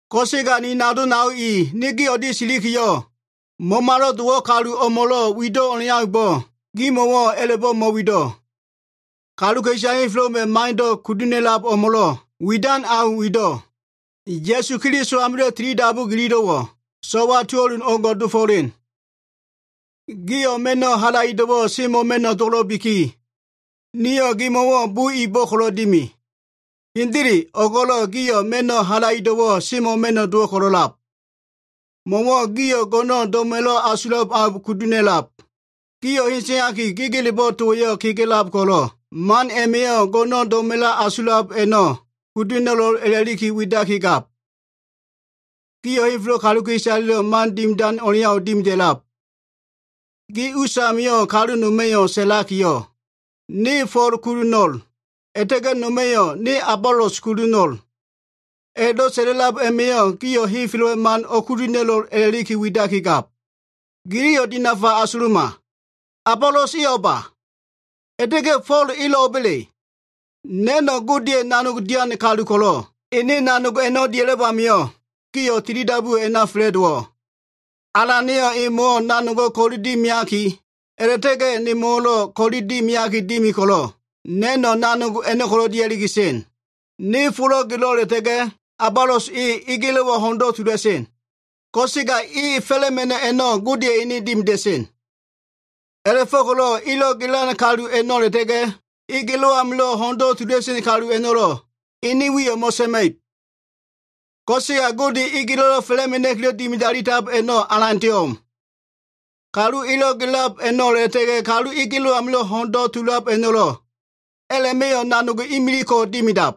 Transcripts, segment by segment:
Ko꞉sega ni nao nado i, ne gi o꞉lia꞉ silikiyo꞉, Mamalo꞉ dowo꞉ kalu o꞉mo꞉lo꞉ wido꞉ o꞉leaumbo꞉ gimo꞉wo꞉ a꞉la꞉bo꞉ mo꞉wido꞉. Kaluka꞉isale henfelo꞉ wema꞉ mando꞉ kudu ha꞉na꞉lab o꞉mo꞉lo꞉ widan au wido꞉. Ya꞉su Keliso amilo꞉ tilidabu gililo꞉wo꞉, so꞉wa tuo꞉lun o꞉ngo꞉ dofo꞉len. Gio꞉ ma꞉no꞉ halaido꞉wo꞉ semo꞉ma꞉no꞉ dowo꞉lo꞉biki, niyo꞉ gimo꞉wo꞉ bo ibo꞉ ko꞉lo꞉ dimi. Hendele o꞉go꞉lo꞉ gio꞉ ma꞉no꞉ halaido꞉wo꞉ semo꞉ma꞉no꞉ dowo꞉ ko꞉lo꞉lab. Mo꞉wo꞉ gio꞉ go꞉no꞉n do꞉mo꞉wa꞉lo꞉ asulab au o꞉kudu ha꞉na꞉lab. Gio꞉ eteaki, gegelebo꞉ towa꞉yo꞉ kega꞉lab ko꞉lo꞉, man a꞉ma꞉yo꞉ go꞉no꞉n do꞉mo꞉wa꞉lo꞉ asulab a꞉no꞉ kudu ha꞉na꞉lo꞉l a꞉la꞉li widakigab. Gio꞉ henfelo꞉ kaluka꞉isaleya꞉lo꞉ man dimidan o꞉leau dimida꞉lab. Gi us amio꞉, kalu noma꞉ sa꞉lakiyo꞉, “Ne Fo꞉l kudu ho꞉no꞉l,” a꞉la꞉ta꞉ga꞉ noma꞉yo꞉, “Ne Abolos kudu ho꞉no꞉l.” A꞉la꞉do꞉ sa꞉la꞉lab a꞉ma꞉yo꞉, gio꞉ henfelo꞉wa꞉ man o꞉kudu ha꞉na꞉lo꞉l a꞉la꞉li widakigab. Giliyo꞉ dinafa asuluma. Abolos e o꞉ba? A꞉la꞉ta꞉ga꞉ Fo꞉l elo꞉ o꞉ba꞉le? Na꞉no꞉ Godeya꞉ nanog dian kalu ko꞉lo꞉, ene nanog a꞉no꞉ dia꞉lab amio꞉, gio꞉ tilidabuwo꞉ a꞉na fa꞉la꞉dowo꞉. Alana꞉yo꞉ emo꞉wo꞉ nanogo꞉ ko꞉li dimiaki, a꞉la꞉ta꞉ga꞉ nemo꞉wo꞉lo꞉ ko꞉li dima꞉ki dimi ko꞉lo꞉, na꞉no꞉ nanog a꞉no꞉ko꞉ dia꞉li sen. Ne folo꞉ gelo꞉, a꞉la꞉ta꞉ga꞉ Abolos e egelo꞉wa ho꞉ndo꞉ tula꞉sen. Ko꞉sega e fa꞉la꞉ma꞉no꞉ a꞉no꞉ Godeya꞉ ene dimida꞉sen. A꞉la꞉fo꞉ko꞉lo꞉ elo꞉ gelan kalu a꞉no꞉ a꞉la꞉ta꞉ga꞉ e gelo꞉ amilo꞉ ho꞉ndo꞉ tula꞉sen kalu a꞉no꞉lo꞉ a꞉ma꞉ wiyo꞉ mo꞉sa꞉ma꞉ib. Ko꞉sega Gode, egelo꞉lo꞉ fa꞉la꞉mena꞉kilo꞉ dimidalitab a꞉no꞉ alandeyo꞉ o꞉m. Kalu elo꞉ gelab a꞉no꞉ a꞉la꞉ta꞉ga꞉, kalu e gelo꞉ amilo꞉ ho꞉ndo꞉ tulab a꞉no꞉lo꞉, a꞉la꞉ma꞉yo꞉ nanogo꞉ imilig ko dimidab.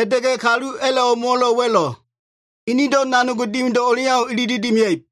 A꞉la꞉ta꞉ga꞉ kalu a꞉la꞉ o꞉mo꞉wo꞉ wa꞉lo꞉, enedo꞉ nanog dimido꞉ o꞉leau ilili dimia꞉ib.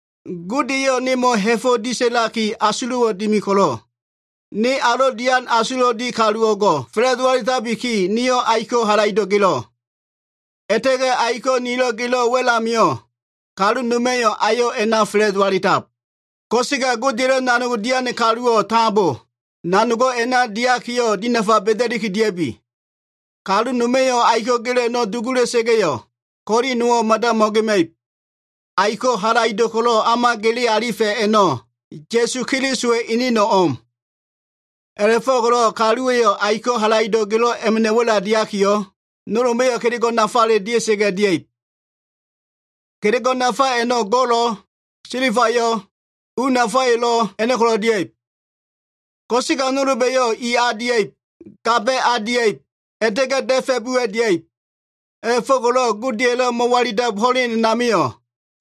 Gode eyo꞉ nemo꞉ ha꞉fo꞉ disa꞉laki asulo꞉wo꞉ dimi ko꞉lo꞉, ne alo꞉ dian asulo꞉lo꞉ di kalu o꞉ngo꞉ fa꞉la꞉do alitabiki, niyo꞉ aiko꞉wo꞉ halaido꞉ gelo꞉. A꞉la꞉ta꞉ga꞉ aiko꞉ nilo꞉ gelo꞉ wa꞉l amio꞉, kalu noma꞉yo꞉ ayo꞉ a꞉na fa꞉la꞉do alitab. Ko꞉sega Godeya꞉ nanogdo꞉ dian kaluwo꞉ tambo nanogo꞉ a꞉na diakiyo꞉ dinafa ba꞉da꞉liki dia꞉bi. Kalu noma꞉yo꞉ aiko꞉ gelo꞉ a꞉no꞉ dugula꞉sa꞉ga꞉yo꞉, ko꞉li nowo꞉ mada mo꞉gema꞉ib. Aiko꞉ halaido꞉ ko꞉lo꞉ o꞉ma gele alifa꞉ a꞉no꞉ Ya꞉su Keliso eneno꞉ o꞉m. A꞉la꞉fo꞉ko꞉lo꞉ kaluwa꞉yo꞉ aiko꞉ halaido꞉ gelo꞉ a꞉ma꞉ wa꞉la diakiyo꞉, nolba꞉yo꞉ kelego꞉ nafale dia꞉sa꞉ga꞉ dia꞉ib. Kelego꞉ nafa a꞉no꞉ go꞉lo꞉, silbayo꞉, u nafale a꞉no꞉ko꞉ dia꞉ib. Ko꞉sega nolba꞉yo꞉ i a dia꞉ib, gamba꞉ a dia꞉ib, a꞉la꞉ta꞉ga꞉ da꞉fa꞉ buwa꞉ dia꞉ib. A꞉la꞉go꞉ko꞉lo꞉ Godeya꞉lo꞉ mo꞉walilabdo꞉ ho꞉len a꞉namio꞉,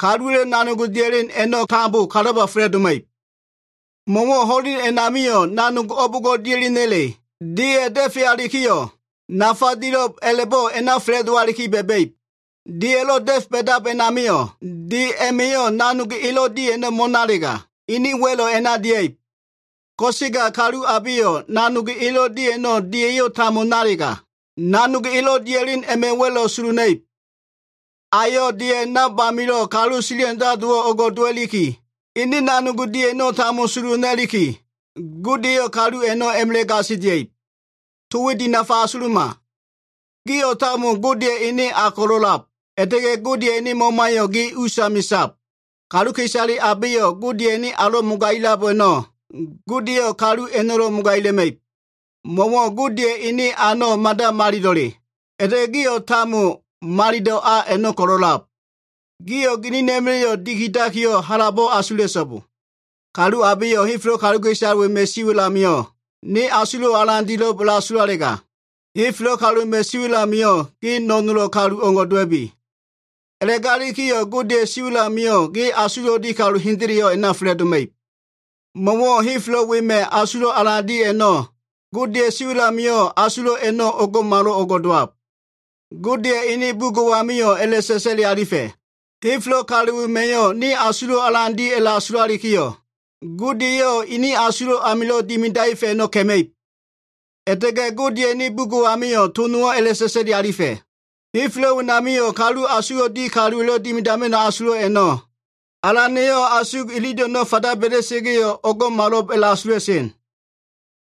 kaluwa꞉lo꞉ nanog dia꞉len a꞉no꞉ tambo kalaba fa꞉la꞉doma꞉ib. Mo꞉wo꞉ ho꞉len a꞉namio꞉, nanog o꞉bo꞉ngo꞉ dia꞉lena꞉le, deya꞉ da꞉fealikiyo꞉, nafa dilo꞉b a꞉la꞉bo꞉ a꞉na fa꞉la꞉dowaliki ba꞉ba꞉ib. Deya꞉lo꞉ da꞉fe ba꞉dab a꞉namio꞉, de a꞉ma꞉yo꞉ nanog elo꞉ di a꞉no꞉ mo꞉nalega, ene wa꞉lo꞉ a꞉na dia꞉ib. Ko꞉sega kalu abeyo꞉ nanog elo꞉ di a꞉no꞉ ko꞉lo꞉ deya꞉yo꞉ tambo nalega, nanog elo꞉ dia꞉len a꞉ma꞉ wa꞉lo꞉ sulu ha꞉na꞉ib. Ayo꞉ deya꞉ nab amilo꞉ kalu sili handalowo꞉ o꞉ngo꞉ dowalikiyo꞉, ene nanog di a꞉no꞉ tambo sulu ha꞉naliki, Gode eyo꞉ kalu a꞉no꞉ a꞉ma꞉la꞉ gasilia꞉ib. To we dinafa asuluma. Gio꞉ tambo Godeya꞉ ene a ko꞉lo꞉ a꞉lab, a꞉la꞉ta꞉ga꞉ Godeya꞉ Mamayo꞉ gi usami sab. Kaluka꞉isale abeyo꞉ Godeya꞉ ene alo꞉ mogagilab a꞉no꞉, Gode eyo꞉ kalu a꞉no꞉lo꞉ mogaila꞉ma꞉ib. Mo꞉wo꞉ Godeya꞉ ene a a꞉no꞉ mada malilo꞉le, a꞉la꞉ta꞉ga꞉ gio꞉ tambo malilo꞉ a a꞉no꞉ ko꞉lo꞉lab. Gio꞉ ginina꞉ma꞉la꞉yo꞉ dikidakiyo꞉ halabo꞉ asula꞉so꞉bo. Kalu abeyo꞉ henfelo꞉ kaluka꞉isale wema꞉ siwa꞉l amio꞉ ne asulo꞉wo꞉ alan dilo꞉b a꞉la꞉asulalega, henfelo꞉ kaluka꞉isale wema꞉ siwa꞉l amio꞉ ge no꞉nolo꞉ kalu o꞉ngo꞉ ko꞉le dowa꞉bi. A꞉la꞉galikiyo꞉ Godeya꞉ siwa꞉l amio꞉ ge asulo꞉lo꞉ di kalu hendeleyo꞉ a꞉na fa꞉la꞉doma꞉ib. Mo꞉wo꞉ henfelo꞉ kaluka꞉isale wema꞉ asulo꞉ alan di a꞉no꞉, Godeya꞉ siwa꞉l amio꞉ asulo꞉ a꞉no꞉ o꞉ngo꞉malo꞉ngo꞉ dowab. Godeya꞉ ene bugo꞉ amio꞉ a꞉la꞉sa꞉sa꞉li alifa꞉, “Henfelo꞉ kalu wema꞉yo꞉ ne asulo꞉wo꞉ alan di a꞉la꞉asulalikiyo꞉, Gode eyo꞉ ene asulo꞉ amilo꞉ dimidaefa꞉ a꞉no꞉ ka꞉ma꞉ib.” A꞉la꞉ta꞉ga꞉ Godeya꞉ bugo꞉ amio꞉ to nowo꞉ a꞉la꞉sa꞉sa꞉li alifa꞉, “Henfelo꞉ wenamio꞉ asugdo꞉ di kaluwa꞉lo꞉ dimidama꞉no꞉ asulo꞉ a꞉no꞉, Alan eyo꞉ asug ililo꞉ a꞉no꞉ fanda ba꞉da꞉sa꞉ga꞉yo꞉, o꞉ngo꞉malo꞉b a꞉la꞉asula꞉sen.”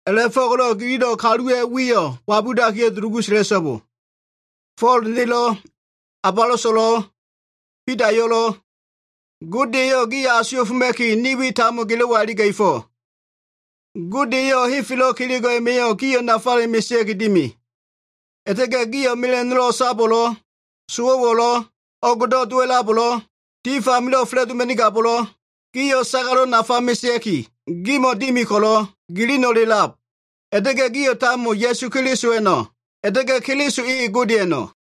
A꞉la꞉fo꞉ko꞉lo꞉ giliyo꞉ kaluwa꞉ wiyo꞉ wabudakiyo꞉ dulugu sa꞉la꞉so꞉bo. Fo꞉l nelo꞉, Aboloso꞉lo꞉, Bidayo꞉lo꞉, Gode eyo꞉ gio꞉ asuwa꞉foma꞉ki, ni we tambo gilo꞉wa iliga꞉fo꞉. Gode eyo꞉ henfelo꞉ kelego꞉ a꞉ma꞉yo꞉ gio꞉ nafale mesea꞉ki dimi. A꞉la꞉ta꞉ga꞉ gio꞉ mela꞉no꞉lo꞉ o꞉sabo꞉lo꞉, sowo꞉wo꞉lo꞉, o꞉gdo꞉ dowa꞉labo꞉lo꞉, tif amilo꞉ fa꞉la꞉doma꞉nigabo꞉lo꞉, gio꞉ sagalo꞉ nafa mesea꞉ki, gimo꞉ dimi ko꞉lo꞉ gilino꞉le a꞉lab. A꞉la꞉ta꞉ga꞉ gio꞉ tambo Ya꞉su Kelisowa꞉no꞉, a꞉la꞉ta꞉ga꞉ Keliso e Godeya꞉no꞉.